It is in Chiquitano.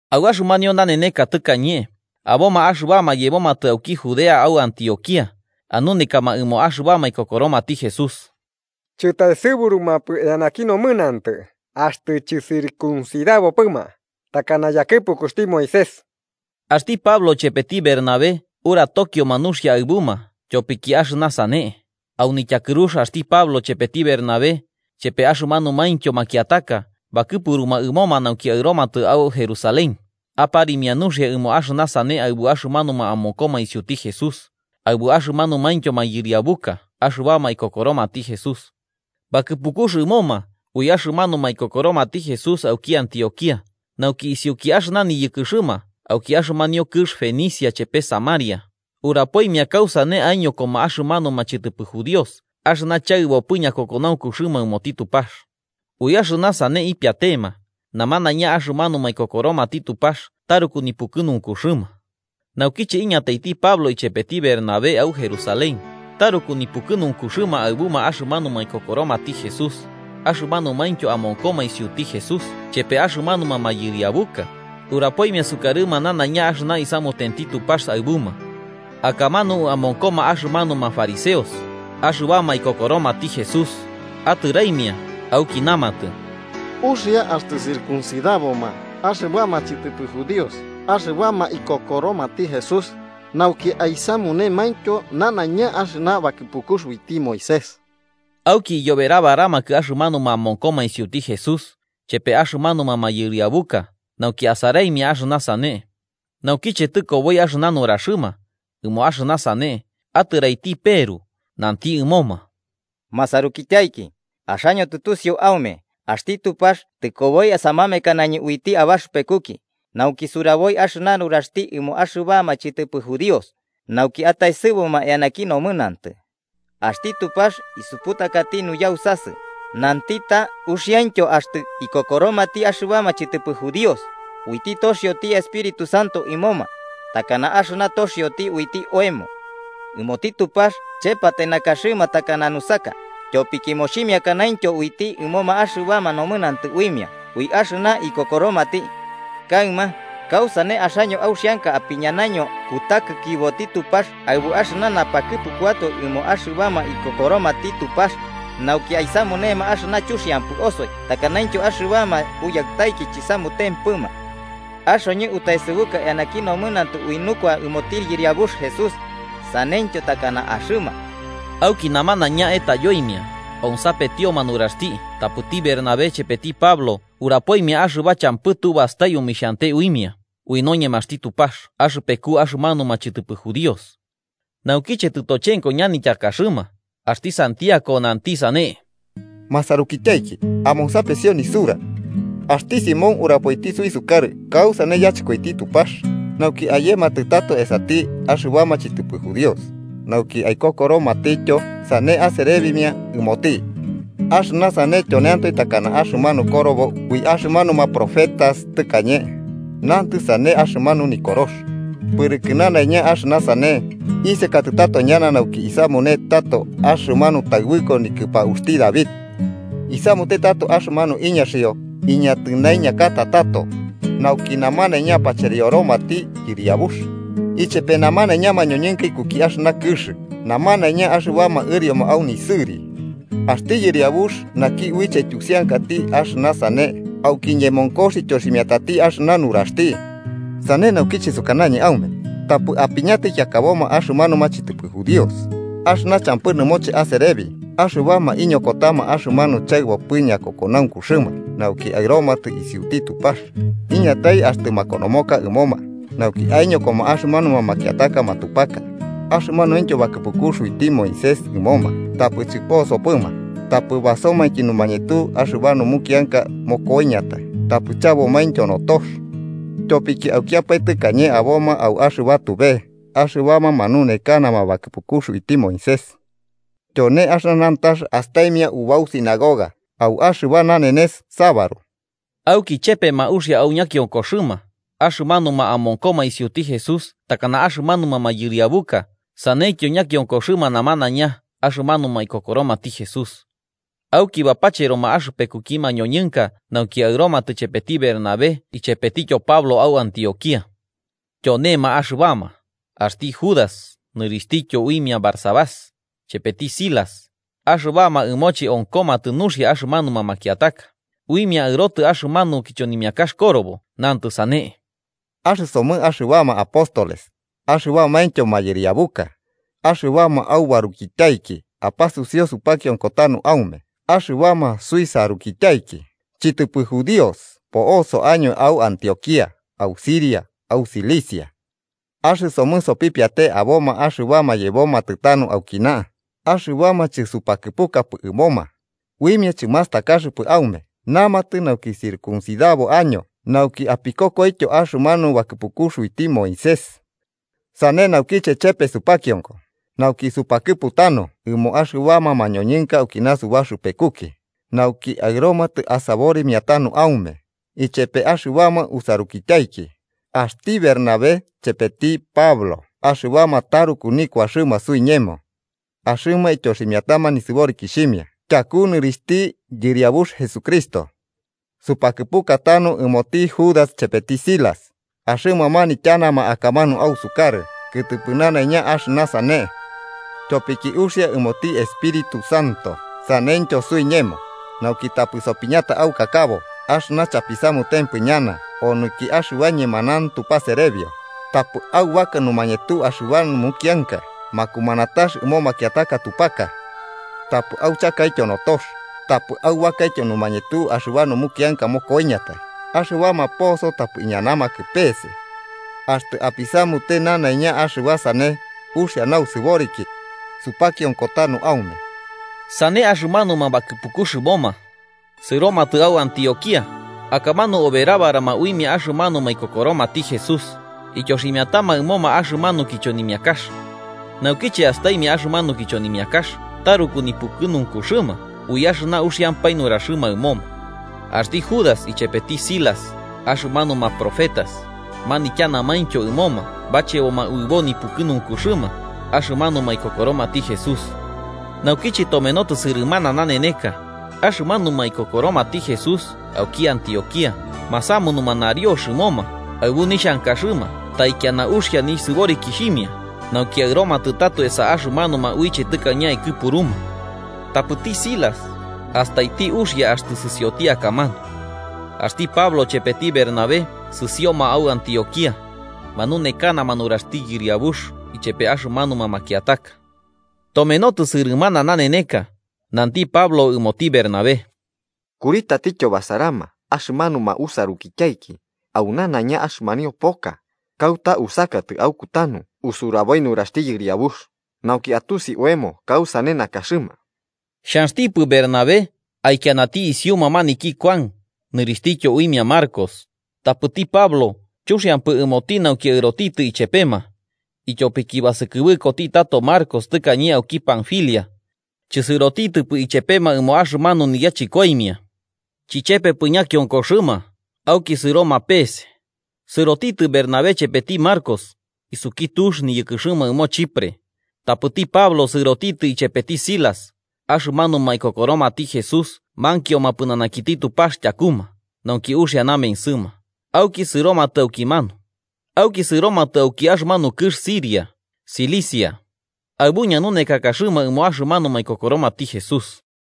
Au axɨmanio naneneka tɨkañe, aboma axɨbama yebomatɨ auki Judea au Antioquía, anunekama ɨmo axɨbama ikokoromati Jesús, chɨtaesɨburupɨma eanaki nomɨnantɨ axtɨ chɨcircuncidabopɨma, takana yakɨpukuxti Moisés. Axti Pablo chepeti Bernabé uratokioma nuxia aɨbuma tyopiki axɨna sane, au nityakɨrux axti Pablo, chepeti Bernabé chepe axɨmanumaintyo makiataka bakɨpuruma ɨmoma nauki aɨromatɨ au Jerusalén, aparimia nuxia ɨmo axɨna sane aɨbu axɨmanuma amonkoma isiuti Jesús, aɨbu axɨmanumaintyo mayɨriabuka axɨbama ikokoromati Jesús. Bakɨpukux ɨmoma ui axɨmanuma ikokoromati Jesús auki Antioquía, nauki isiuki axɨna niyɨkɨxɨma auki axɨmanio kɨx Fenicia chepe Samaria, urapoimia kausane aiñokoma axɨmanuma chɨtɨpɨ judíos axɨna chaɨbopɨ ñakokonaunkuxɨma ɨmoti Tupax. Ui axɨna sane ipiatema, namanaiña axɨmanuma ikokoromati Tupax taruku nipukɨnunkuxɨma. Naukiche iñataiti Pablo ichepeti Bernabé au Jerusalén, taruku nipukɨnunkuxɨma aɨbuma axɨmanuma ikokoromati Jesús, axɨmanumaintyo amonkoma isiuti Jesús chepe axɨmanuma mayɨriabuka, urapoimia sukarɨma nanaiña axɨna isamutenti Tupax aɨbuma. Akamanu amonkoma axɨmanuma fariseos, axɨbama ikokoromati Jesús, atɨraimia auki namatɨ: –Uxia axtɨ circuncidaboma axɨbama chɨtɨpɨ judíos axɨbama ikokoromati Jesús, nauki aisamunemaintyo nanaiña axɨna bakɨpukux uiti Moisés. Auki iyoberabaramakɨ axɨmanuma amonkoma isiuti Jesús chepe axɨmanuma mayɨriabuka nauki asaraimia axɨna sane. Naukiche tɨkoboi axɨna nuraxɨma, ɨmo axɨna sane, atɨraiti Peru nanti ɨmoma: –Masarukityaiki, axaño tusiu aume, axti Tupax tɨkoboi samamekanañɨ uiti abaxɨpekuki nauki suraboi axɨna nuraxti ɨmo axɨbama chɨtɨpɨ judíos, nauki ataesɨbuma eanaki nomɨnantɨ. Axti Tupax isuputakaiti nuyausasɨ, nanti ta uxiaintyo axtɨ ikokoromati axɨbama chɨtɨpɨ judíos, uiti toxioti Espíritu Santo ɨmoma, takana axɨna toxio uiti oemo. Ɨmoti Tupax chepatai nakaxɨma takana nusaka, tyopiki moximiakanaintyo uiti ɨmoma axɨba nomɨnantɨ uimia ui axɨna ikokoromati. Kaɨma, ¿kausane axaño auxianka apiñanaño kutakikiboti Tupax aɨbu axɨna napakɨpukuatoe ɨmo axɨbama ikokoromati Tupax, nauki aisamunema axɨna chuxiantempɨ osoi takanaintyo axɨbama uyaɨtaiki chisamutempɨma? Axoñɨ utaesɨbuka eanaki nomɨnantɨ ui nukua ɨmoti Yɨriabux Jesús, saneityo takana axɨma. Auki namanaiña etayoimia onsapetioma nuraxti tapɨti Bernabé chepeti Pablo urapoimia axɨba champɨ tu bastai omixhante uimia ui noñemaxti Tupax axɨpeku axɨmanuma chɨtɨpɨ judíos. Naukiche tɨtochenko ñanityakaxɨma, axti Santiago nanti sane: –Masarukityaiki amonsapesio nisura: Axti Simón urapoiti suisukarɨ kausane yachɨkoiti Tupax nauki ayematɨ tato esati axɨbama chɨtɨpɨ judíos, nauki aikokoromatityo sane aserebimia ɨmoti. Axɨna sane tyoneantoe takana axɨmanu korobo ui axɨmanuma profetas tɨkañe, nantɨ sane axɨmanu Nikorox: ‘Pɨrɨkɨ nanaiña axɨna sane, isekatɨ tato ñana nauki isamune tato axɨmanu taɨbɨko nikɨpauxti David. Isamute tato axɨmanu iñaxio iñatɨnaiñakata tato, nauki namanaiña apacherioromati Yɨriabux, ichepe namanaiña mañoñɨnka ikuki axɨna kɨx namanaiña axɨbama ɨrioma au nisɨri. Axti Yɨriabux naki uiche aityusiakati axɨna sane auki ñemonkox ityoximiatati axɨna nuraxti.’ “Sane naukiche sukanañɨ aume, tapɨ apiñata ikiakaboma axɨmanuma chɨtɨpɨ judíos, axɨna champɨ nɨmoche aserebi axɨbama iñokotama axɨmanu chaɨbopɨ ñakokonaunkuxɨma nauki aɨromatɨ isiuti Tupax. Iñatai axtɨ makonomoka ɨmoma, nauki aiñokoma axɨmanuma makiataka matupaka, axɨmanuintyo bakɨpukux uiti Moisés ɨmoma tapɨ chɨposopɨma, tapɨ basomainki numañetu axɨba numukianka mokoiñatai tapɨ chabomaintyo notox. Tyopiki aukiapae tɨkañe aboma au axɨba tube axɨbama manunekanama bakɨpukux uiti Moisés. Tyone axɨna nantax astaimia ubau sinagoga au axɨba nanenes sabaru.” Auki chepema uxia au ñakionkoxɨma, axɨmanuma amonkoma isiuti Jesús takana axɨmanuma mayɨriabuka saneityo ñakionkoxɨma namanaiña axɨmanuma ikokoromati Jesús. Auki bapacheroma axɨpekuki mañoñɨnka nauki aɨromatɨ ichepeti Bernabé ichepetityo Pablo au Antioquía. Tyonema axɨbama, axti Judas nɨrixhtityo uimia Barsabás, chepeti Silas, axɨbama ɨmoche onkomatɨ nuxia axɨmanuma makiataka, uimia aɨrotɨ axɨmanu kichonimiakax korobo nantɨ sane: “Axɨsomɨ axɨbama apóstoles, axɨbamaintyo mayɨriabuka, axɨbama aubarukityaiki apasusiu supakionko tanu aume, axɨbama suisarukityaiki, chɨtɨpɨ judíos po'oso año au Antioquía au Siria au Cilicia. Axɨsomɨ sopipiate aboma axɨbama yebomatɨ tanu aukina, axɨbama chɨsupakɨpukapɨ ɨmoma, uimia chɨmastakaxɨpɨ aume namatɨ nauki circusidabo año nauki apikokoityo axɨmanu bakɨpukux uiti Moisés. Sane naukiche chepe supakionko, nauki supakɨpu tanu ɨmo axɨbama mañoñɨnka aukina subaxɨpekuki, nauki aɨromatɨ asaborimia tanu aume, ichepe axɨbama usarukityaiki, axti Bernabé chepeti Pablo axɨbama taruku nikuaxɨma suiñemo. Axɨma ityoximiatama nisɨborikixhimia tyaku nɨrixhti Yɨriabux Jesucristo. Supakɨpuka tanu ɨmoti Judas chepeti Silas: axɨma manityanama akamanu ausukarɨ kɨtɨpɨ nanaiña axɨna sane. Tyopiki uxia ɨmoti Espíritu Santo saneityo suiñemo, nauki tapɨ sopiñata aukakabo axɨna chapisamutempɨ ñana onɨnki axɨba ñemanauntu paserebio: tapɨ aubaka numañetu axɨba numukianka makumanatax ɨmo makiataka tupaka. Tapɨ auchakaityo notox, tapɨ aubakaityo numañetu axɨba numukianka mokoiñatai, axɨbama poso tapɨ iñanamakɨ peese. Axtɨ apisamute nanaiña axɨba sane, uxia nausɨboriki. Supakionko tanu aume.” Sane axɨmanuma bakɨpukux ɨmoma, sɨromatɨ au Antioquía, akamanu oberabarama uimia axɨmanuma ikokoromati Jesús, ityoximiatama ɨmoma axɨmanu kichonimiakax. Naukiche astaimia axɨmanu kichonimiakax, taruku nipukɨnunkuxɨma ui axɨna uxiampae nuraxɨma ɨmoma. Axti Judas ichepeti Silas, axɨmanuma profetas, manityanamaintyo ɨmoma bacheboma uɨbo nipukɨnunkuxɨma axɨmanuma ikokoromati Jesús. Naukiche tomenotɨ sɨrɨmana naneneka, axɨmanuma ikokoromati Jesús auki Antioquía masamunuma nariox ɨmoma aɨbu nixhankaɨma taikiana uxia nisɨborikixhimia nauki aɨromatɨ tato esa axɨmanuma uiche tɨkañe aikɨpuruma. Tapɨti Silas, astaiti uxia axtɨ sɨsioti akamanu. Axti Pablo chepeti Bernabé sɨsioma au Antioquía, manunekanama nuraxti Yɨriabux ichepe axɨmanuma makiataka. Tomenotɨ sɨrɨmana naneneka, nanti Pablo ɨmoti Bernabé: –Kuri tatityo basarama axɨmanuma usarukityaiki au nanaiña axɨmanio poka, kauta usakatɨ aukutanu usuraboi nuraxti Yɨriabux, nauki atusi oemo kausane nakaxɨma. Xhanxtipɨ Bernabé aikianati isiuma maniki Kuan nɨrixhtityo uimia Marcos. Tapɨti Pablo chuxiampɨ ɨmoti nauki aɨrotitɨ ichepema, ityopiki basɨkɨbɨkoti tato Marcos tɨkañe auki Panfilia, chɨsɨrotitɨpɨ ichepema ɨmo axɨmanu niyachɨkoimia. Chichepepɨ ñakionkoxɨma, auki sɨroma peese. Sɨrotitɨ Bernabé chepeti Marcos, isuki tux niyɨkɨxɨma ɨmo Chipre, tapɨti Pablo sɨrotitɨ ichepeti Silas, axɨmanuma ikokoromati Jesús mankioma pɨnanakiti Tupax tyakuma nauki uxia namensɨma, auki sɨromatɨ aukimanu, auki sɨromatɨ auki axɨmanio kɨx Siria, Cilicia. Aɨbu ñanunekakaxɨma ɨmo axɨmanuma ikokoromati Jesús.